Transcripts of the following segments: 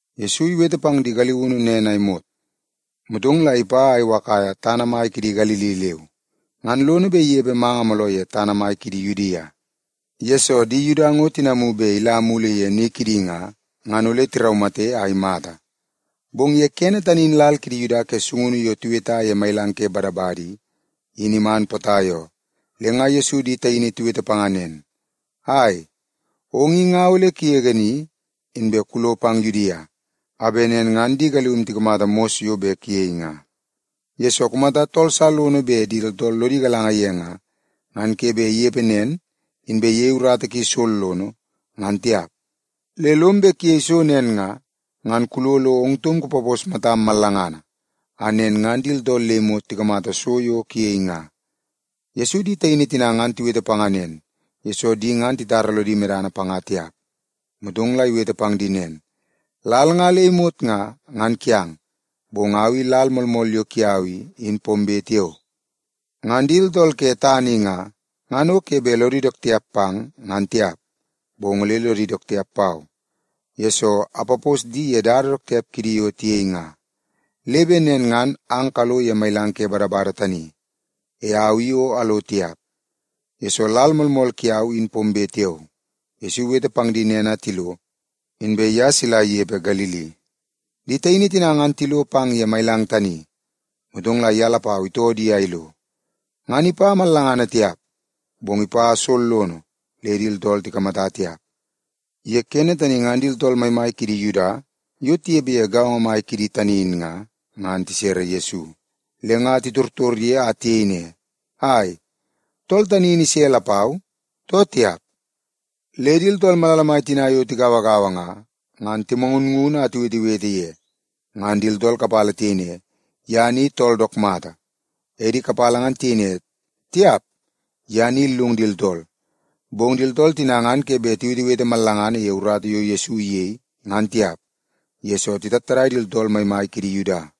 Yesu iwete pang di galiunu nen a imot, motong la ipa a iwakaia tana mai kidi Galili leu. Ngan lono bet inepe manga mooloo ye tana mai ke Yudia, yesoo di Yuda ngo tinamu bet ila mulu ni kidi nga, ngan ole tiraumate a imata. Bong ye kene tani in lal kidi Yuda ke sungunu yo tiweta ye Mailang ke Badabada i, in iman potai oo. Le nga Yesu di taini tiwete panga nen, “Ai, ong i nga ole kugege ni, inbe kulo pang Yudia, a bet nen ngan di galium tikamata mos yo bet kuyei nga. Yesoo, kumata tool sa lono bet di tooltool lodi galanga ye nga, ngan ke bet inepe nen inbe iyei urata ki sollono, ngan tiap. Le lom bet kuyei so nen nga, ngan kulo lo ong taum kupapos matam mallangana, a nen ngan di tooltool le imot tikamata so yo kuyei nga.” Yesu di taini tina ngan tiwete panga nen, yesoo di ngan titara lodi medana panga tiap. Motong la iwete pang di nen, “Lal nga le imot nga, ngan kiang, bong au i lal moolmool yo kiau i, in pombe tiao. Ngan di tooltool ke tana i nga, ngan o ke bet lodi dook tiap pang, ngan tiap, bong ole lodi dook tiap pau, yesoo apapos di ye dada dook tiap kidi yo tiyei nga. Le bet nen ngan ang kalo ye Mailang ke Badabada tani. E au i o alo tiap, yesoo lal moolmool kiau in pombe tiao.” Yesu iwete pang di nen a tilo, inbe ye sila inepe Galili. Di taini tina ngan tilo pang ye mailang tani, motong la ye lapau itoo di a ilo. Ngan ipa mallangana tiap, bong ipa sollono le di tooltool tikamata tiap. Ye kene tani ngan di tooltool maimai kidi Yuda yo tinepe ye gaongo mai kidi tani in nga, ngan tisere Yesu. Le nga titortor ye a tiyei ne, “Ai, tool tani in ise lapau, too tiap?” Le di tooltool malala mai tina yo tigauagaua nga, ngan timangunngun a tiwetewete ye. Ngan di tooltool kapala tiyei ne, “Ye ni tool dook mata.” E di kapala ngan tiyei ne, “Tiap, ye ni illung di tooltool.” Bong di tooltool tina ngan ke bet tiwetewete mallangana ye urata yo Yesu iyei, ngan tiap, yesoo titattadai di tooltool maimai kidi Yuda.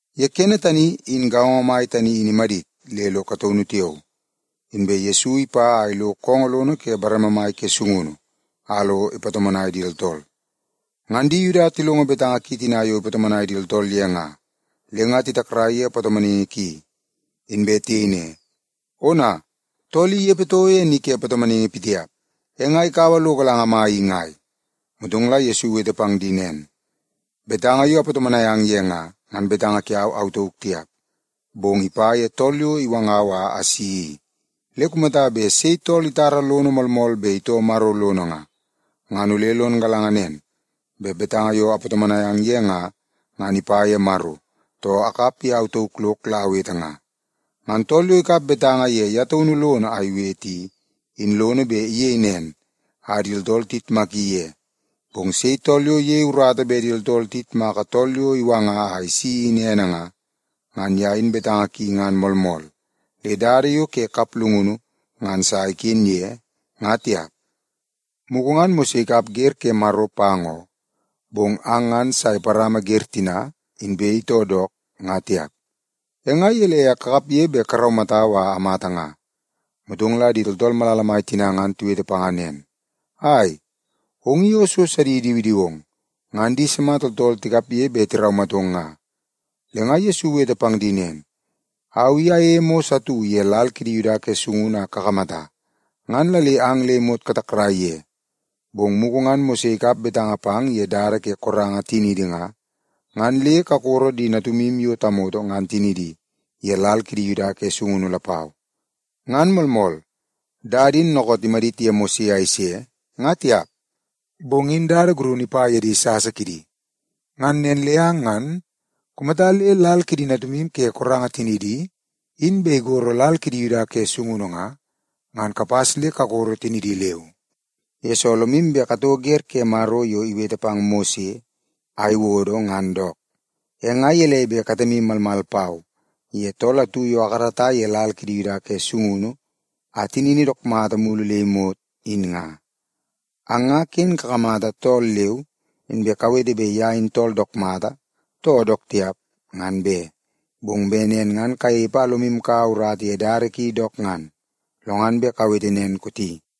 Ye kene tani, in gaongo mai tani in imadit le ilo kataunu tiao, inbe Yesu ipa a ilo koongoo lono ke bareme mai ke sungunu a lo ipatomonai di tooltool. Ngan di Yuda tilongo betanga ki tina yo ipatomonai di tooltool ye nga, le nga titakrai ye patomonaingi ki. Inbe tiyei ne, “Ona, tool i inepe toko ye ni ke patomonaingi pitiap. E nga ikaua lo galanga mai i ngai?” Motong la Yesu iwete pang di nen, “Betanga yo apatomonai ang ye nga, ngan betanga kiau au tauk tiap, bong ipa ye tool yo iwangau a asi i. Le kumata bet sei tool itara lono moolmool bet itoo Maro lono nga, ngan ole lon galanga nen, bet betanga yo apatomonai ang ye nga, ngan ipa ye Maro, too akap ye au tauk lok la awete nga. Ngan tool yo ikap betanga ye ye taunu lono a iwete i, in lono bet iyei nen a di tooltool tiyitmaki ye. Bong sei tool yo iyei urata bet di tooltool tiyitmaka tool yo iwanga a isi in ene nga, ngan ye in betanga ki ngan moolmool, le dada yo ke kaplungunu ngan sa iken ye, nga tiap. Mugu ngan Mose ikap wer ke Maro pang oo, bong ang ngan sa iparama wer tina, inbe itoo dook, nga tiap. E nga gelei a kakapge bet karaumatau a amata nga?” Motong la di tooltool malala mai tina ngan tiwete panga nen, “Ai, ong i o so sidi idiwidiwong! Ngan di sima tooltool tikapge bet tiraumatong nga?” Le nga Yesu iwete pang di nen, “Au i ayeie mos atu ye lal kidi Yuda ke sungunu a kakamata, ngan la le ang le imot katakrai ye. Bong mugu ngan Mose ikap betanga pang ye dada ke koranga tiniidi nga, ngan le kakoro di natumu yo tamoto ngan tinidi ye lal kiidi Yuda ke sungunu lapau. (Ngan moolmool dada in dookoot imadit ye Mose a ise, nga tiap, bong in dada gurunu ipa ye di sasa kidi.) Ngan nen le ang ngan kumata le lal kidi natumu ke koranga tinidi in bet igoro lal kidi Yuda ke sungunu nga, ngan kapas le kakoro tinidi leu. Yesoo, lomu bet katoo wer ke Maro yo iwete pang Mose a iwodo ngan dook. E nga gelei bet katemu malmal pau ye tool atu yo akarata ye lal kidi Yuda ke sungunu a tinini dook mata mulu le imot, in nga? Ang nga ken kakamata tool leu, inbe kawete bet ye in tool dook mata, too dook tiap, ngan be! Bong bet nen ngan kanepe a lomu kaua urata ye dada ki dook ngan, lo ngan bet kawete nen kooti.”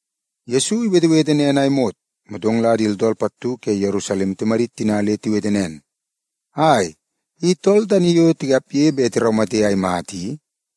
Yesu iwetewete nen a imot, motong la di tooltool pattu ke Yerusalem timadit tina le tiwete nen, “Ai, i tool tani yo tikapge bet tiraumate a imata i?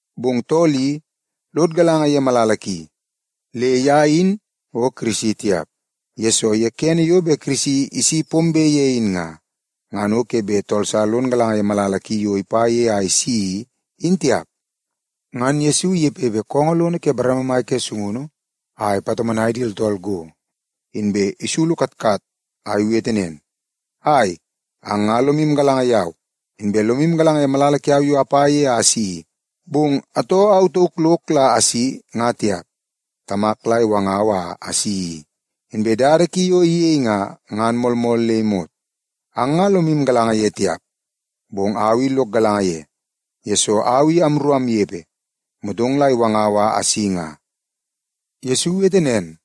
Bong tool i, lod galanga ye malala ki, le ye in o Kirisi tiap. Yesoo, ye kene yo bet Kirisi isi pombe ye in nga, ngan o ke bet tool sa lon galanga ye malala ki yo ipa ye a isi i, in tiap.” Ngan Yesu inepepe koongoo lono ke bareme mai ke sungunu a ipatomonai di tooltool go, inbe isulu katkat a iwete nen, “Ai, ang nga lomu galanga yau, inbe lomu galanga ye malala kiau yo apa ye a asi i. Bong atoo au tauk lok la asi nga tiap, Tamak la iwangau a asi i. Inbe dada ki yo iyei nga, ngan moolmool le imot. Ang nga lomu galanga ye tiap, bong au i lok galanga ye, yesoo au i amru amnepe, motong la iwangau a asi nga.” Yesu iwete nen,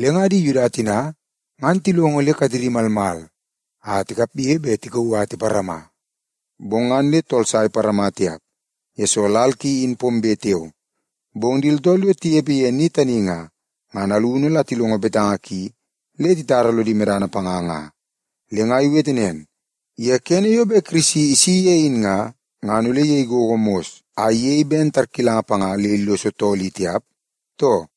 le nga di Yuda tina ngan tilongo le katedi malmal a tikapge bet tikauu a tiparama. Bong ngan le tool sa iparama tiap, yesoo lal ki in pombe tiao. Bong di tooltool yo tinepe ye ni tani nga, ngan alunu la tilongo betanga ki le titara lodi medana panga nga. Le nga tiwete nen, “Ye kene yo bet Kirisi isi ye in nga, ngan ole iyei gogo mos a iyei ben tarkilanga panga le illoso tool i tiap, too?”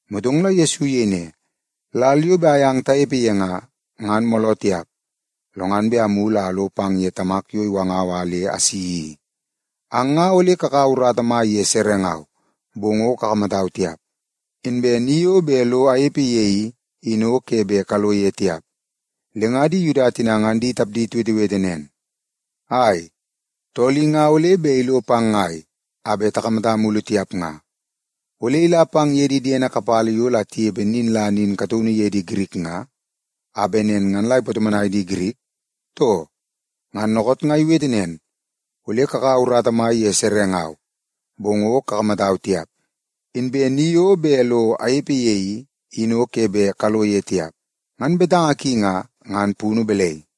Motong la Yesu iyei ne, “Lal yo bet ayang tanepe ye nga, ngan mooloo tiap, lo ngan bet amulu a alo pang ye Tamak yo iwangau a le asi i. Ang nga ole kakaua urata mai ye serengau, bong o kakamatau tiap. Inbe ni yo bet lo anepe ye i, in o ke bet kalo ye tiap.” Le nga di Yuda tina ngan di tapdi tiwetewete nen, “Ai, tool i nga ole bet ilo pang ngai a bet takamata mulu tiap nga? Ole ila pang ye di diede kapala yo la tinepe nin la nin kataunu ye di Girik nga, a bet nen ngan la ipatomonai di Girik, too? Ngan dookoot nga iwete nen, ‘Ole kakaua urata mai ye serengau, bong o kakamatau tiap. Inbe ni yo bet lo anepe ye i, in o ke bet kalo ye tiap.’ Ngan betanga ki nga, ngan punu balai?”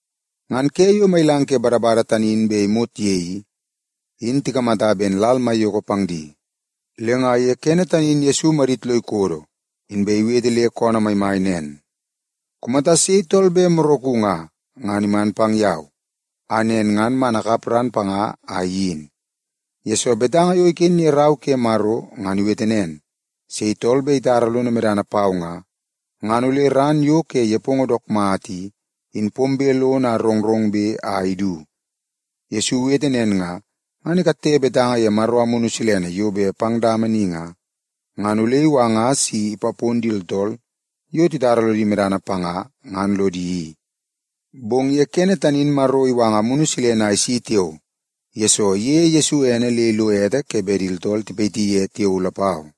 Ngan ke yo Mailang ke Badabada tani bet imot ye i, in tikamata ben lal maiyoko pang di. Le nga ye kene tani in Yesu imadit lo ikodo, inbe iwete le koonoo maimai nen, “Kumata sei tool bet moraku nga, ngan iman pang yau, a nen ngan man akap ran panga a iyin. Yesoo, betanga yo iken ye Rau ke Maro ngan iwete nen, sei tool bet itara lono medana pau nga, ngan ole ran yo ke nepongo dook mata i, in pombe lono a rongrongbe a idu.” Yesu iwete nen nga, ngan ikatte betanga ye Maro Amunu Silene yo bet pang dama ni nga, ngan ole iwanga si ipapon di tooltool yo titara lodi medana panga ngan lodi i. Bong ye kene tani in Maro iwanga Amunu Silene a isi tiao, yesoo iyeie Yesu ene le ilo ete ke bet di tooltool tipayiti ye tiao lapau.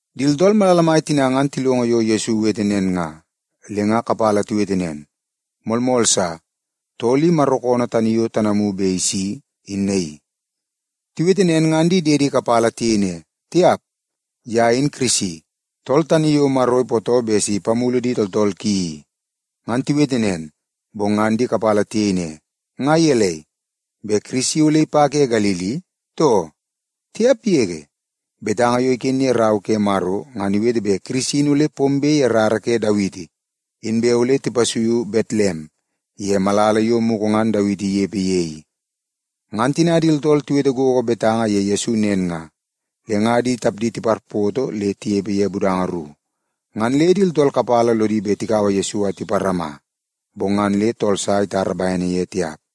Di tooltool malala mai tina ngan tilongo yo Yesu iwete nen nga, le nga kapala tiwete nen, “Moolmool sa! Tool i Maro koonoo tani yo tanamu bet isi, in naii.” Tiwete nen, ngan di diedi kapala tiyei ne, “Tiap! Ye in Kirisi, tool tani yo Maro ipootoo bet si ipamulu di tooltool ki i.” Ngan tiwete nen, bong ngan di kapala tiyei ne, “Nga gelei, bet Kirisi ole ipa ke Galili, too? Tiap yege! Betanga yo iken ye Rau ke Maro ngan iwete bet Kirisi in ole pombe ye rara ke Dawiti. Inbe ole tipasuiu Betlem ye malala yo mugu ngan Dawiti inepe ye i.” Ngan tina di tooltool tiwete gogo betanga ye Yesu nen nga, le nga di tapdi tiparpoto le tinepe ye budanga ru. Ngan le di tooltool kapala lodi bet tikaua Yesu a tiparama, bong ngan le tool sa itara bene ye tiap.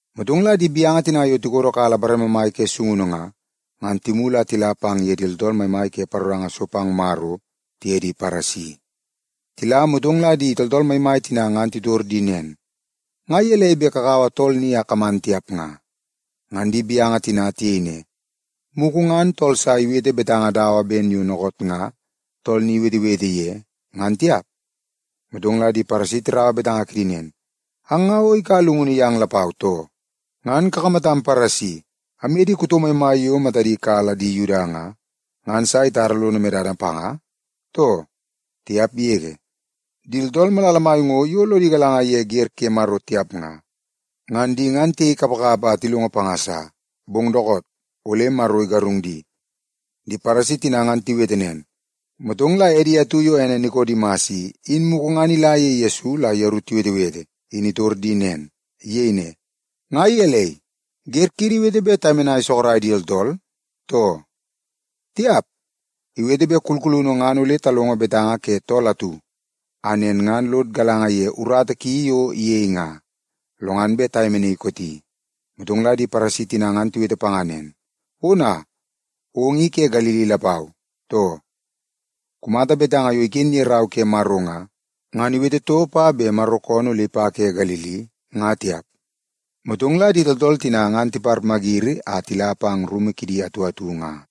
Motong la di gaunu tina yo tikodokala bareme mai ke sungunu nga, ngan timulu a tila pang ye di tooltool maimai ke paroranga so pang Maro tiye di Paresi. Tila, motong la di tooltool maimai tina ngan titor di nen, “Nga gelei bet kakaua tool ni a kaman tiap nga?” Ngan di gaunu tina tiyei ne, “Mugu ngan tool sa iwete betanga dawa ben yo dookoot nga tool ni iwetewete ye nga, ngan tiap.” Motong la di Paresi tirau betanga kidi nen, “Ang nga o ikaua llungunu yang lapau, too? Ngan kakamatam Paresi amye di kuto maimai yo matadi kala di Yuda nga, ngan sa itara lono medana panga, too? Tiap yege! Di tooltool malala mai ngo, yo lodi galanga ye wer ke Maro tiap nga, ngan di ngan tiyei kapakapa a tilongo panga sa. Bong dookoot, ole Maro igarung di.” Di Paresi tina ngan tiwete nen, motong la edi atu yo ene Nikodimas i, in mugu ngan ila ye Yesu la yeru tiwetewete, in itor di nen. Iyei ne, “Nga gelei, wer kiidi iwete bet tayemenai sorok di tooltool, too? Tiap, iwete bet kulkulunu ngan ole talongo betanga ke tool atu, a nen ngan lod galanga dook ye urata ki yo iyei nga, lo ngan bet tayemenaii kooti.” Motong la di Paresi tina ngan tiwete panga nen, “Ona, ong i ke Galili lapau, too? Kumata betanga yo iken ye Rau ke Maro nga, ngan iwete toko pa bet Maro koonoo ole ipa ke Galili, nga tiap.” Motong la di tooltool tina ngan tiparmayiri a tila pang ye rumu kidi atu atu nga.